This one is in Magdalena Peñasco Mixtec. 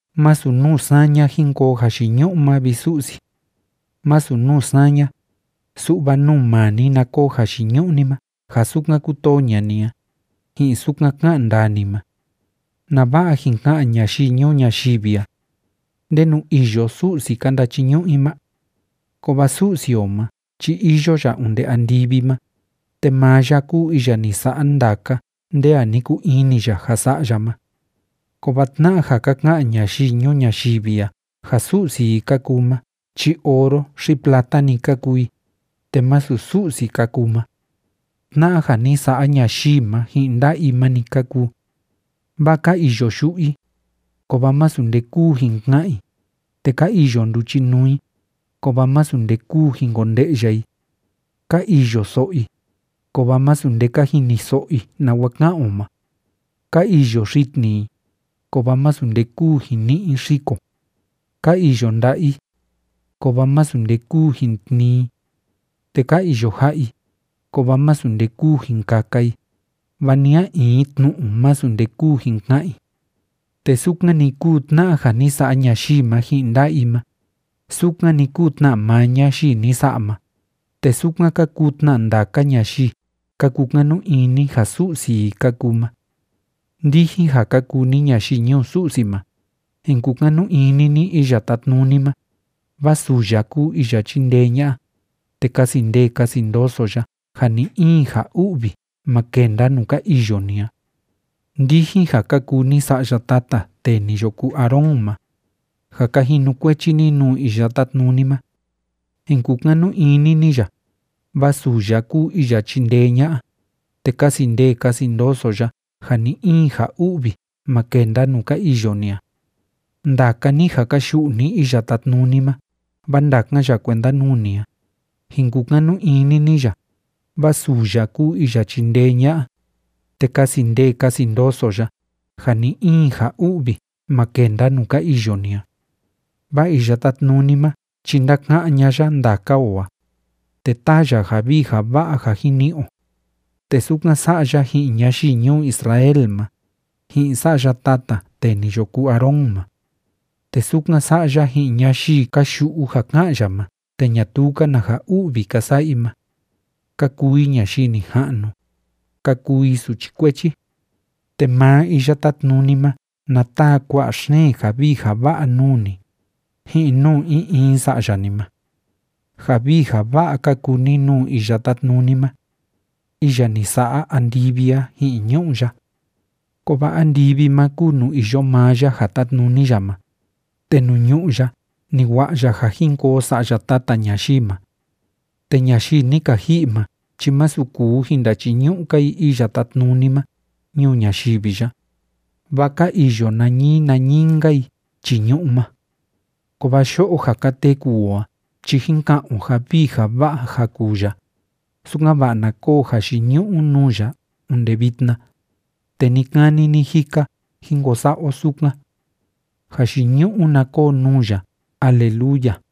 Masu nuu saña jin koo jayiñu'u ma, vi Su'si. Masu nuu saña, su'va nuu maa ni na koo jayiñu'u ni ma ja sukan kútoo ña'a ni a, ji'in sukan ká'an ndaa ni ma. ¿Nava'a jin ka'an ñayii ñuu ñayivi a: “¿Ndenu iyo Su'si ka ndachiñu'u i ma?”? Kovaa Su'si o ma chi iyo ya onde andivi ma, te maa ya kúu iya ni sa'a ndaka nde a ni kuu ini ya ja sa'a ya ma. Kovaa tna'a ja ka ka'an ñayii ñuu ñayivi a ja su'si i ka kuu ma chi oro xi plata‑ni ka kuu i, te másu Su'si ka kuu ma. Tna'a ja ni sa'a ñayii ma ji'in nda'a i ma‑ni ka kuu. Vaa ka iyo yu'u i, kovaa masu nde kúu jin ka'an i, te ka iyo nduchinuu i, kovaa masu nde kúu jin konde'ya i. Ka iyo so'o i, kovaa masu nde ka jiniso'o i nawa ká'an o ma. Ka iyo xitni i, kovaa masu nde kúu jin ni'i i xiko. Ka iyo nda'a i, kovaa masu nde kúu jin tnii i, te ka iyo ja'a i, kovaa masu nde kúu jin kaka i, va ni a in tnu'u masu nde kúu jin ka'an i. Te sukan‑ni kúu tna'a ja ni sa'a ñayii ma ji'in nda'a i ma, sukan‑ni kúu tna maa ñayii ni sa'a ma, te sukan ka kuu tna ndaka ñayii ka kukanu ini ja su'si i ka kuu ma. Ndijin ja ka kuu ni ñayii ñuu Su'si ma, jin kukanu ini ni Iya Tátnuni ma, vaa suu ya kúu iya chíndee ña'a, te kasi ndee kasi ndoso ya ja ni‑in ja u'vi ma kenda nuu ka iyo ni a. Ndijin ja ka kuu ni sa'ya tata tee ni yo kuu Aarón ma ja ka jinukuechi ni nuu Iya Tátnuni ma, jin kukanu ini ni ya, vaa suu ya kúu iya chindee ña'a, te kasi ndee kasi ndoso ya ja ni‑in ja u'vi ma kenda nuu ka iyo ni a. Ndaka ni ja ka yu'u ni Iya Tátnuni ma vaa ndakan ya kuenda nuu ni a, jin kukanu ini ni ya, vaa suu ya kúu iya chíndee ña'a, te kasi ndee kasi ndoso ya ja ni‑in ja u'vi ma kenda nuu ka iyo ni a. Vaa Iya Tátnuni ma chi ndáka'án ña'a ya ndaka o a, te táa ya ja vii ja va'a ja jin ni'i o, te sukan sa'a ya ji'in ñayii ñuu Israel ma, ji'in sa'ya tata tee ni yo kuu Aarón ma. Te sukan sa'a ya ji'in ñayii ka yu'u ja ká'an ya ma te ñatuu‑ka na ja u'vi ka sa'a i ma, ka kuu i ñayii nija'nu, ka kuu i suchi kuechi. Te maa Iya Tátnuni ma na taa kua'a xeen ja vii ja va'a nuu ni, ji'in nuu in in sa'ya ni ma. Ja vii ja va'a ka kuu ni nuu Iya Tátnuni ma, iya ni sa'a andivi a ji'in ñu'ú ya. Kovaa andivi ma kúu nuu iyo maa ya ja tátnuni ya ma, te nuu ñu'ú ya ni wa'a ya ja jin koo sa'ya tata ñayii ma. Te ñayii ni ka ji'i ma chi másu kuu jin ndachiñu'u‑ka i Iya Tátnuni ma ñuu ñayivi ya, vaa ka iyo nañii nañii‑nka i chii ñu'ú ma. Kovaa yo'o ja ka teku o a chi jín ka'an o ja vii ja va'a ja kuu ya, sukan‑va'a na koo jayiñu'u nuu ya onde vitna, te ni‑kani ni‑jika jín ko sa'a o sukan. ¡Jayiñu'u na koo nuu ya! ¡Aleluya!